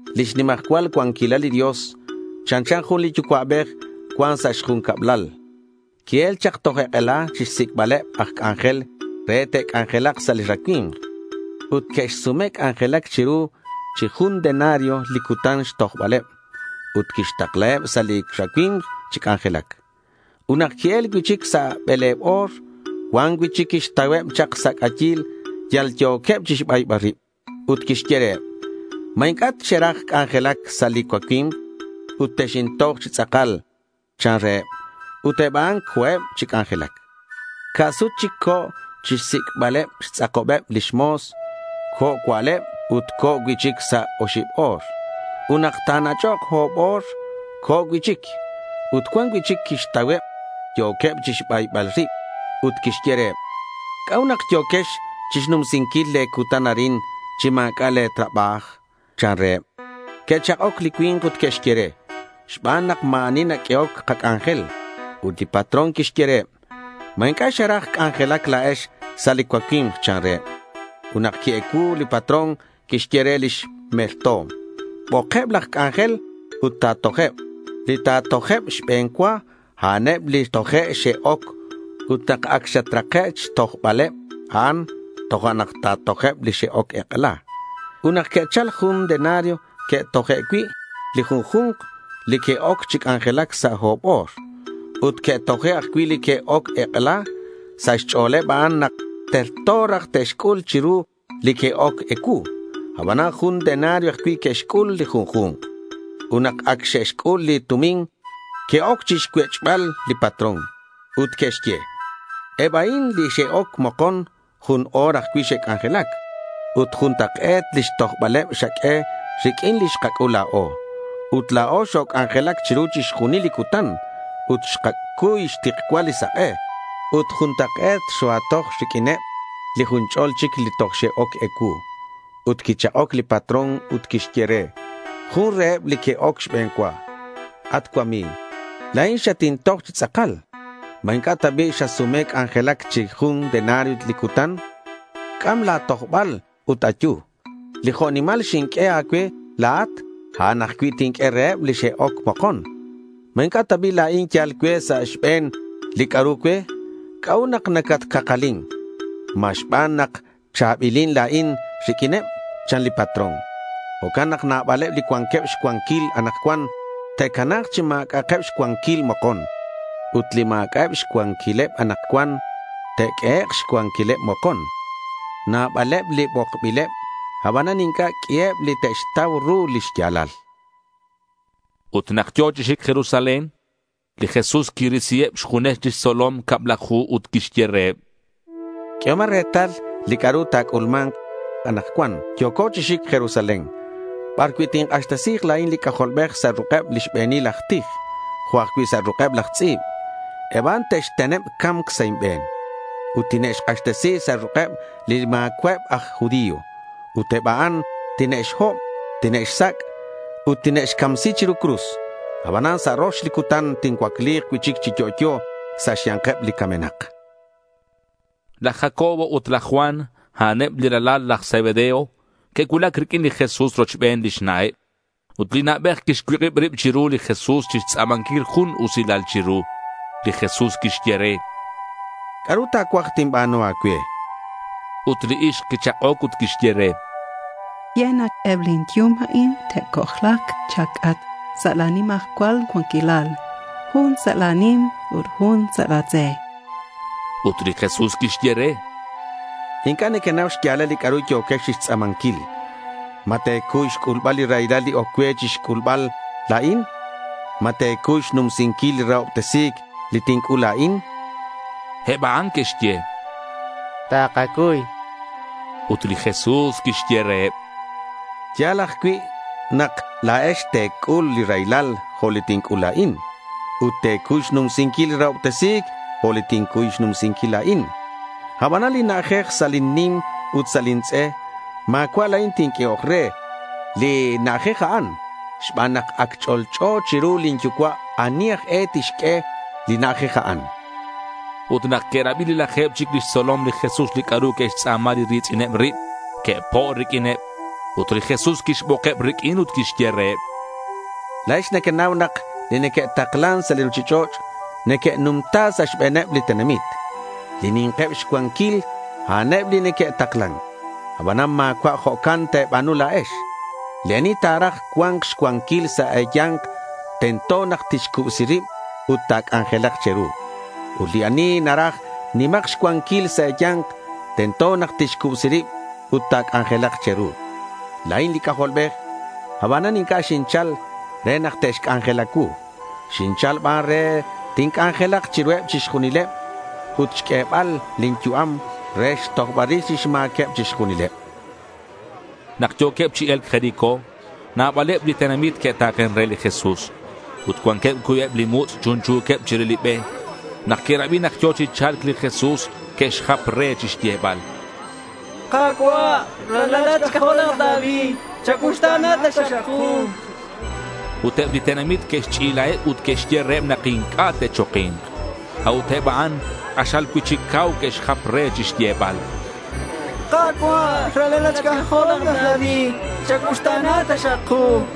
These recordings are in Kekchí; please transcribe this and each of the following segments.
Lix nimajcual cuanquilal li Dios chanchan jun li yucua'bej cuan sa' xjun cablal. Qui-el chak toj ek'ela chixsic'baleb aj c'anjel re te'c'anjelak sa' li racui̱mk. Ut que'xsume c'anjelac chiru chi jun denario li cutan xtojbaleb. Ut quixtaklaheb sa' li racui̱mk chi c'anjelac. Ut nak qui-el cui'chic sa' bele̱b o̱r, cuan cui'chic quixtauheb chak sa' c'ayil yal yo̱queb chixbaybal rib. Ut quixye reheb: —¿Ma inc'a' xeraj c'anjelac sa' li cuacui̱mk ut texintoj chi tz'akal? chan reheb. Ut eb a'an co̱eb chi c'anjelac. Ca' sut chic co̱ xsic'baleb xtz'akobeb lix mo̱s. Co̱ cua'leb ut co̱ cui'chic sa' oxib o̱r. Ut nak ta̱nach'ok o̱b o̱r, co̱ cui'chic. Ut cuan cui'chic quixtauheb yo̱queb chixbaybal rib. Ut quixye reheb: —¿C'a'ut nak yo̱quex chixnumsinquil le̱ cutan arin chi ma̱c'a' le̱ trabaj? chan reheb. Que'chak'oc li cui̱nk ut que'xye re: —Xban nak ma̱ ani naq'uehoc kac'anjel.— Ut li patrón quixye reheb: —¿Ma inc'a' xeraj c'anjelac la̱ex sa' li cuacui̱mk? chan reheb. Ut nak qui-ecuu, li patrón quixye re lix merto̱m: —Bokeb laj c'anjel ut ta̱tojeb. Li ta̱tojeb xbe̱n cua, a'aneb li toje' xe'oc, ut nak ac xatrake' xtojbaleb a'an, tojo'nak ta̱tojeb li xe'oc ek'ela.— Ut nak que'chal, jun denario que'toje' cui' li junju̱nk li que'oc chi c'anjelac sa' o̱b o̱r. Ut que'toje' ajcui' li que'oc ek'ela. Sa' xch'o̱leb a'an nak terto raj te'xc'ul chiru li que'oc ecuu. Abanan jun denario ajcui' que'xc'ul li junju̱nk. Ut nak ac xe'xc'ul li tumin, que'oc chixcuech'bal li patrón. Ut que'xye: —Eb a'in li xe'oc mokon jun o̱r ajcui' xe'c'anjelac. Ut juntak'e̱t lix tojbaleb xaq'ue riq'uin li xkac'ul la̱o. Ut la̱o xoc'anjelac chiru chixjunil li cutan ut xkacuy xtikcual li sak'e ut juntak'e̱t xoa̱toj riq'uineb li jun ch'o̱l chic li toj xe'oc ecuu.— Ut quichak'oc li patrón ut quixye re jun reheb li que'oc xbe̱n cua: —At cuami̱g, la̱in xatintoj chi tz'akal. ¿Ma inc'a' ta bi' xasume c'anjelac chi jun denario li cutan? C'am la̱ tojbal ut ayu. Li jo' nimal xinq'ue a̱cue la̱at, a'an ajcui' tinq'ue reheb li xe'oc mokon. ¿Ma inc'a' ta bi' la̱in yal cue sa' xbe̱n li c'a'ru cue? ¿C'a'ut nak nacatcakalin? ¿Ma xban nak cha̱bilin la̱in riq'uineb? chan li patrón. Jo'can nak nabaleb li cuanqueb xcuanquil anakcuan te'cana̱k chi ma̱c'a'ak xcuanquil mokon. Ut li ma̱c'a'eb xcuanquileb anakcuan, te'q'uehek' xcuanquileb mokon. Nabaleb li bokbileb, abanan inc'a' q'uiheb li te'xtau ru li xya̱lal. Ut nak yo̱ chi xic Jerusalén, li Jesús quirisiheb xjunes lix tzolom cablaju ut quixye reheb: —Q'uehomak retal li c'a'ru ta̱c'ulma̱nk. Anakcuan yo̱co chi xic Jerusalén bar cui' tink'axtesi̱k la̱in li C'ajolbej sa' ruk'eb li xbe̱nil aj tij jo' ajcui' sa' ruk'eb laj tz'i̱b. Eb a'an te'xteneb ca̱mc sa' inbe̱n. Ut tine'xk'axtesi sa' ruk'eb li ma̱cua'eb aj judío. Ut eb a'an tine'xhob, tine'xsac', ut tine'xcamsi chiru cruz. Abanan sa' rox li cutan tincuacli̱k cui'chic chi yo'yo sa' xya̱nkeb li camenak, chan li Jesús. Laj Jacobo ut laj Juan, a'aneb li ralal laj Zebedeo. Que'cuulac riq'uin li Jesús rochben lix na'eb. Ut li na'bej quixcuik'ib rib chiru li Jesús chixtz'a̱manquil jun usilal chiru. Li Jesús quixye re: —¿C'a'ru ta̱cuaj tinba̱nu a̱cue?— Ut li ixk quichak'oc ut quixye re: —Ye nak eb lin yum a'in te'c'ojla̱k cha̱c'atk sa' la̱ nimajcual cuanquilal, jun sa' la̱ nim ut jun sa' la̱ tz'e, chan. Ut li Jesús quixye re: —Inc'a' nequenau xya̱lal li c'a'ru yo̱quex chixtz'a̱manquil. ¿Ma te̱cuy xc'ulbal li raylal li oc cue chixc'ulbal la̱in? ¿Ma te̱cuy xnumsinquil li rahobtesi̱c li tinc'ul la̱in?— Eb a'an que'xye: —Takacuy, chanqueb. Ut li Jesús quixye reheb: —Ya̱l ajcui' nak la̱ex te̱c'ul li raylal jo' li tinc'ul la̱in. Ut te̱cuy xnumsinquil li rahobtesi̱c jo' li tincuy xnumsinquil la̱in. Abanan li na'ajej sa' lin nim ut sa' lin tz'e ma̱cua' la̱in tinq'uehok re li na'ajej a'an xban nak ac ch'olch'o chiru lin yucua' ani aj e tixq'ue li na'ajej a'an, chan li Jesús reheb. Ut nak que'rabi li laje̱b chic lix tzolom li Jesús li c'a'ru que'xtz'a̱ma li ri̱tz'ineb rib, que'po' riq'uineb. Ut li Jesús quixbokeb riq'uin ut quixye reheb: —La̱ex nequenau nak li neque'taklan sa' li ruchich'och' neque'numta sa' xbe̱neb li tenamit. Li ni̱nkeb xcuanquil, a'aneb li neque'taklan. Abanan ma̱cua' jo'can te̱ba̱nu la̱ex. Li ani ta̱raj cua̱nk xcuanquil sa' e̱ya̱nk, tento nak tixcubsi rib ut ta̱c'anjelak che̱ru. Ut li ani naraj nima̱k xcuanquil sa' e̱ya̱nk, tento nak tixcubsi rib ut ta̱c'anjelak che̱ru. La̱in li C'ajolbej. Abanan inc'a' xinchal re nak te'xc'anjela cuu. Xinchal ban re tinc'anjelak chiruheb chixjunil ut re xq'uebal lin yu'am re xtojbal rix lix ma̱queb chixjunileb.— Nak yo̱queb chi e̱lc Jericó, nabaleb li tenamit que'ta̱ken re li Jesús. Ut cuanqueb cuibeb li mutz' chunchu̱queb chire li be. Nak que'rabi nak yo̱ chi cha̱lc li Jesús, que'xjap re chixyebal: —Ka̱cua', Ralalat xc'ajol laj David. ¡Chacuuxta̱na taxak ku!— Ut eb li tenamit que'xch'ilaheb ut que'xye reheb nak inc'a' te'choki̱nk. A'ut eb a'an k'axal cui'chic cau que'xjap re chixyebal: —¡Ka̱cua', ralalat xc'ajol laj David, chacuuxta̱na taxak ku!—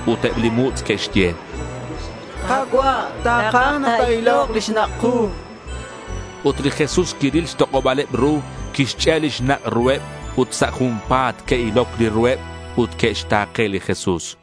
Ut eb li mutz' que'xye: —Ka̱cua', takaj ta̱ilok li xnak' ku.— Ut li Jesús quiril xtok'oba̱leb ru, quixch'e' li xnak' ruheb. Ut sa' junpa̱t que'iloc li ruheb ut que'xta̱ke li Jesús.